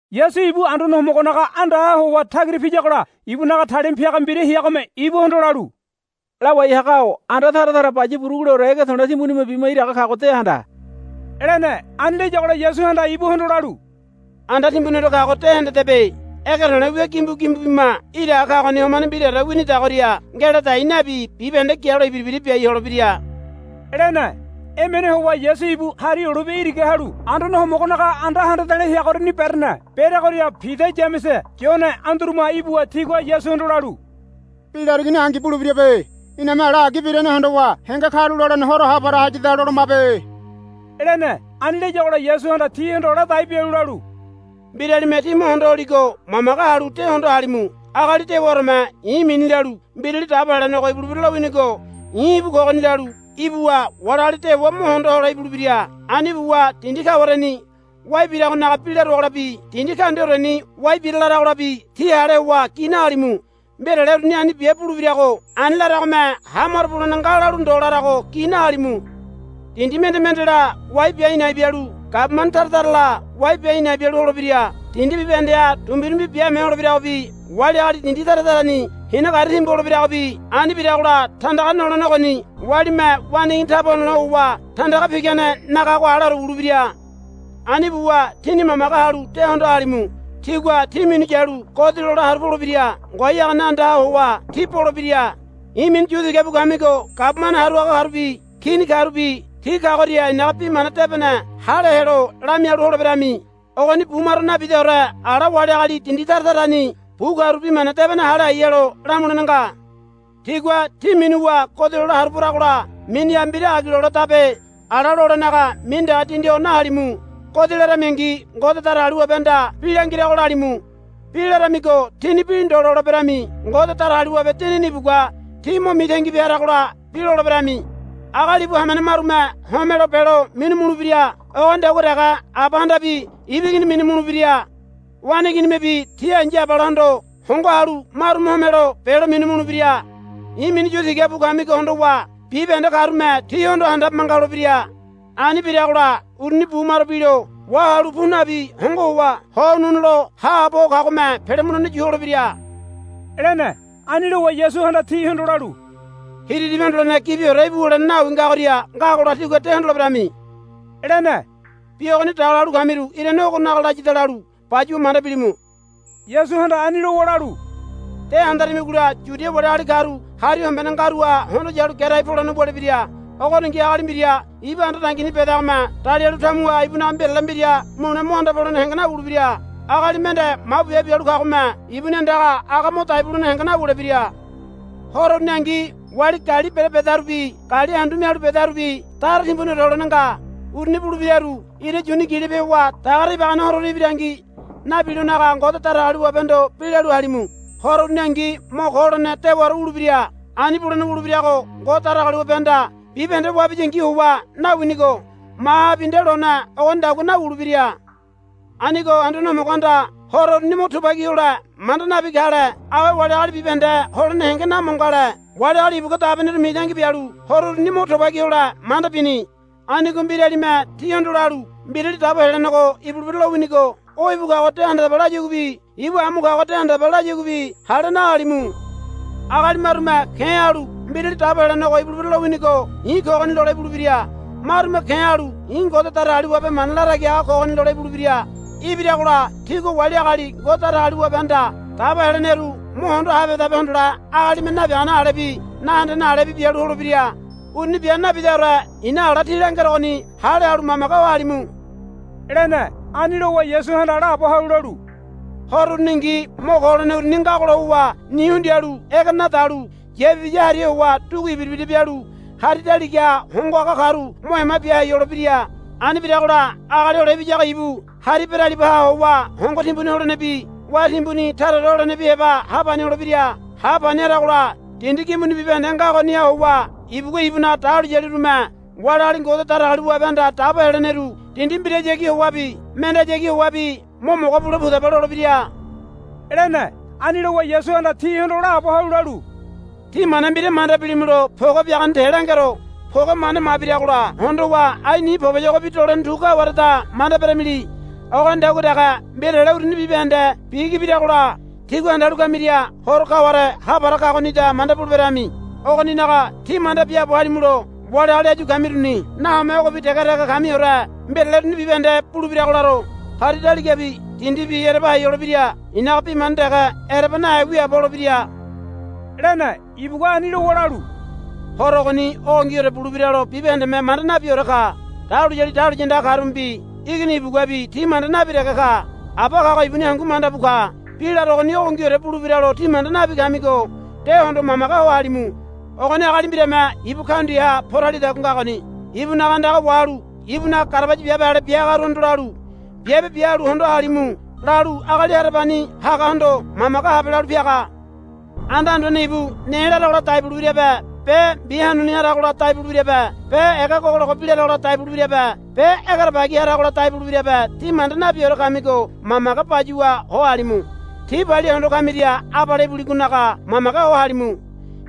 Yasu ibu Anduane Homogonaga andaha howa tagira piyagola ibunaga talima piaga mbira heagome ibuhondo lalu, Lawai haga-o anda tara tara baya buruguleore ege to̱le̱ timbunime bima iraga kago de handa, lene. Ani layagola Yasuhanda ibuhondo lalu, Anda timbuniore kago de hendedebe. Ege to̱le̱ wia gimbu gimbu bima iraga kagoni homane mbiraore winidagoria ngeladai nabi bibahende gialo ibira ibira biai holebira, lene. Emene howa Yasu ibu Hari Olibe iraga halu Anduane Homogonaga anda handa de̱le̱ heagoriani berene. Bereagoria Pida Yamese Yone Anduruma ibuwa tigua Yasuhondo lalu, Bi larigoni angi bulebirabe. Iname ala agi birane hondowa henge karulolene horo ha para hayada lolomabe, lene. Ani layagola Yasuhanda tihondo ladai bialu lalu, Mbiralime tí mo hondo holigo mamage halu de hondo halimu. Agali dewaoreme i̱ mini lalu, Mbirali Dabo Helenego ibulebira lowinigo i̱ íbu kogoni, lalu ibuwa wali agali dewa mo hondo hole ibulebira. Ani buwa dindi kawareni wai biragonaga bi laruagolabi dindi kaundiaoreni wai bira laragolabi tí hale howa gi nahalimu. Mbirale uruni ani bia bulebirago ani laragome ha maro bulene nga lalu ndo larago gi nahalimu. Dindi mende mendela wai bia a̱i̱ na̱i̱ bialu gabumane tara tarala wai bia a̱i̱ na̱i̱ bialu holebira. Dindi bibahendeha dumbirumbi biame holebiragobi wali agali dindi tara tarani hina gari timbu holebiragobi. Ani biragola tandaga nolene ogoni walime waneigini taba honole howa tandaga pigane nagago aleore wulebira. Ani buwa tíni mamage halu de hondo halimu. Tigua tí minu yalu godi lole haru polebira. Ngoai hagane andaha howa tí bolebira. I̱ mini yu tiga bu kamigo gabumane haru haga karubi kini karubi ti kagoria i̱naga Bi Mana Debene hale helo lamialu holeberami. Ogoni bu maro nabidaore ala wali agali dindi tara tarani bu karu bi mana debene hale hai helo lamulene nga. Tigua tí minuwa godi lole haru poragola miniha mbira agi loledabe ala lolenaga mini dege dindi ho nahalimu. Godi laramingi Ngode Datagaliwabehanda bi langirago lalimu. Bi laramigo tíni bi lole ndo berami. Ngode Datagaliwabe Dinini ibugua tí mo mitangi bia haragola bi loleberami. Agali ibu hamene marume homelo belo minu mulebira. Ogonidagua dege abahandabi ibu igini minu mulebira. Waneiginimebi ti ai̱ya abalahondo hongo halu marume homelo belo minu mulebira. I̱ mini yu tiga bu kamigo hondowa bibahende karume tíhondo handabe manga holebira. Ani biragola uruni bu maro bilo wahalu pu nabi hongo howa ho ununu lo haabo ho kagome pele mulene yu holebira, lene. Ani lowa Yasuhanda tihondo lalu, Hiriribi Hondolene Gibiore íbu wulene nawi ngagoria ngagola tígua de hondoleberami, lene. Bi ogoni daga lalu kamiru irane ogonaga layada lalu bayuwa manda bilimu. Yasuhanda ani lowa lalu, De handaramigola Yudia wali agali karu hari hombene ngaruha hondo yalu gerai polene wulebira. Ogoningi agali mbira ibu anda dangini bedagome dalialu tamuha ibunaga mbirale mbira mule mo anda polene henge nawulebira. Agali mende mabu biabe bialu kagome ibuni andaga aga mo dai bulene henge nawulebira. Horo uruningi wali gali bere bedarubi gali andu mialu bedarubi dara timbuniore holene nga. Uruni bulebiraru ira yuni gilope howa dagare ibagane hororu birangi nabilonaga Ngode Datagaliwabehondo bi lalu halimu. Horo uruningi mo ko holene dewaore wulebira. Ani bulene wulebirago Ngode Datagaliwabehanda bibahende wabiyangi howa nawinigo mahabi nde lone ogonidagua nawulebira. Anigo Anduane Homogohanda horo uruni mo tubagi hole manda nabi kale awe wali agali bibahende holene henge namo ngale. Wali agali ibugua dabeneru mitangi bialu horo uruni mo tubagi hole manda bini. Anigo mbiralime tíhondo lalu, Mbirali Dabo Helenego ibulebira lowinigo o ibu kago de handadaba, layaguabi, Ibu amu kago de handadaba, layaguabi hale nahalimu. Agali marume ke̱ halu Mbirali Dabo Helenego ibulebira lowinigo i̱ kogoni, lole ibulebira. Marume ke̱ halu, I̱ Ngode Datagaliwabe mana latagi haga kogoni, lole ibulebira. Ibiragola tigua wali agali Ngode Datagaliwabehanda dabo heleneru mo hondo habehedabe hondole agalime nabiagane alebi nahendene alebi bialu holebira. Uruni bia nabidaore i̱na ala tí langerogoni hale halu mamage ho halimu, lene. Ani lowa Yasuhanda laabo halu lalu, Horo uruningi mo ko holene uruni ngagola howa ni hundialu ege nadalu yapibiya hariha howa dugu ibira ibira bialu hari daligaha hongo haga karu mo ema bia hai holebira. Ani biragola Agali Hole Ibiyago ibu hari beralibaha howa hongo timbuni holenebi wá timbuni taraore holenebi heba ha pani holebira. Ha pani haragola dindi gimbuni bibahende ngagoniha howa ibugua ibunaga dahuliyalirume wali agali Ngode Datagaliwabehanda dabo heleneru dindi mbirahayagi howabi mendehayagi howabi, Mo mogo bule pudaba, lolebira, lene. Ani lowa Yasuhanda tihondo laabo halu lalu, Tí mana mbira manda bilimulo poge biagane te langero. Poge mane mabiragola hondowa ai ni poboyogo dolene tu kawareda manda beramili. Ogonidagua dege mbirale uruni bibahende bigi biragola tígua handalu kamiria horo kaware ha para kagonida manda buleberami. Ogoninaga tí manda biaabo halimulo wali agali áyu kamiruni nahome ogobi dege dege kamiore mbirale uruni bibahende bulebirago laro. Hari daligabi dindibi ereba hai holebira. I̱naga bi mana dege ereba nahe wiaabo holebira, lene. Ibugua ani lowa lalu, Horo ogoni ogongiore bulebiralo bibahendeme manda nabiore ka. Dahuliyali dahuliya andaga karumebi Igini ibuguabi ti manda nabi dege ka. Aba kago ibuni hangu manda bu ka. Bi larogoni ogongiore bulebiralo tí manda nabi kamigo de hondo mamage ho halimu. Ogoni agali mbirame ibu kaundiaha poralidagua ngagoni. Ibunaga andaga wahalu ibunaga garabaya biabe ale bia hagaruhondo lalu, Biabe bia halu hondo halimu, lalu agali harabani hagahondo, Mamage habe, lalu piaga. Anda anduane ibu ne laragola dai bulebirabe be mbi hanuni haragola dai bulebirabe be ega gogologo bi laragola dai bulebirabe be egerebagi haragola dai bulebirabe tí manda nabiore kamigo mamage bayuwa ho halimu. Tí palia hondo kamiria abale ibuligonaga mamage ho halimu.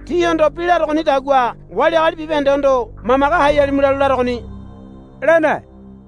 Tíhondo bi larogonidagua wali agali bibahendehondo, Mamage hai halimu lalu larogoni, lene.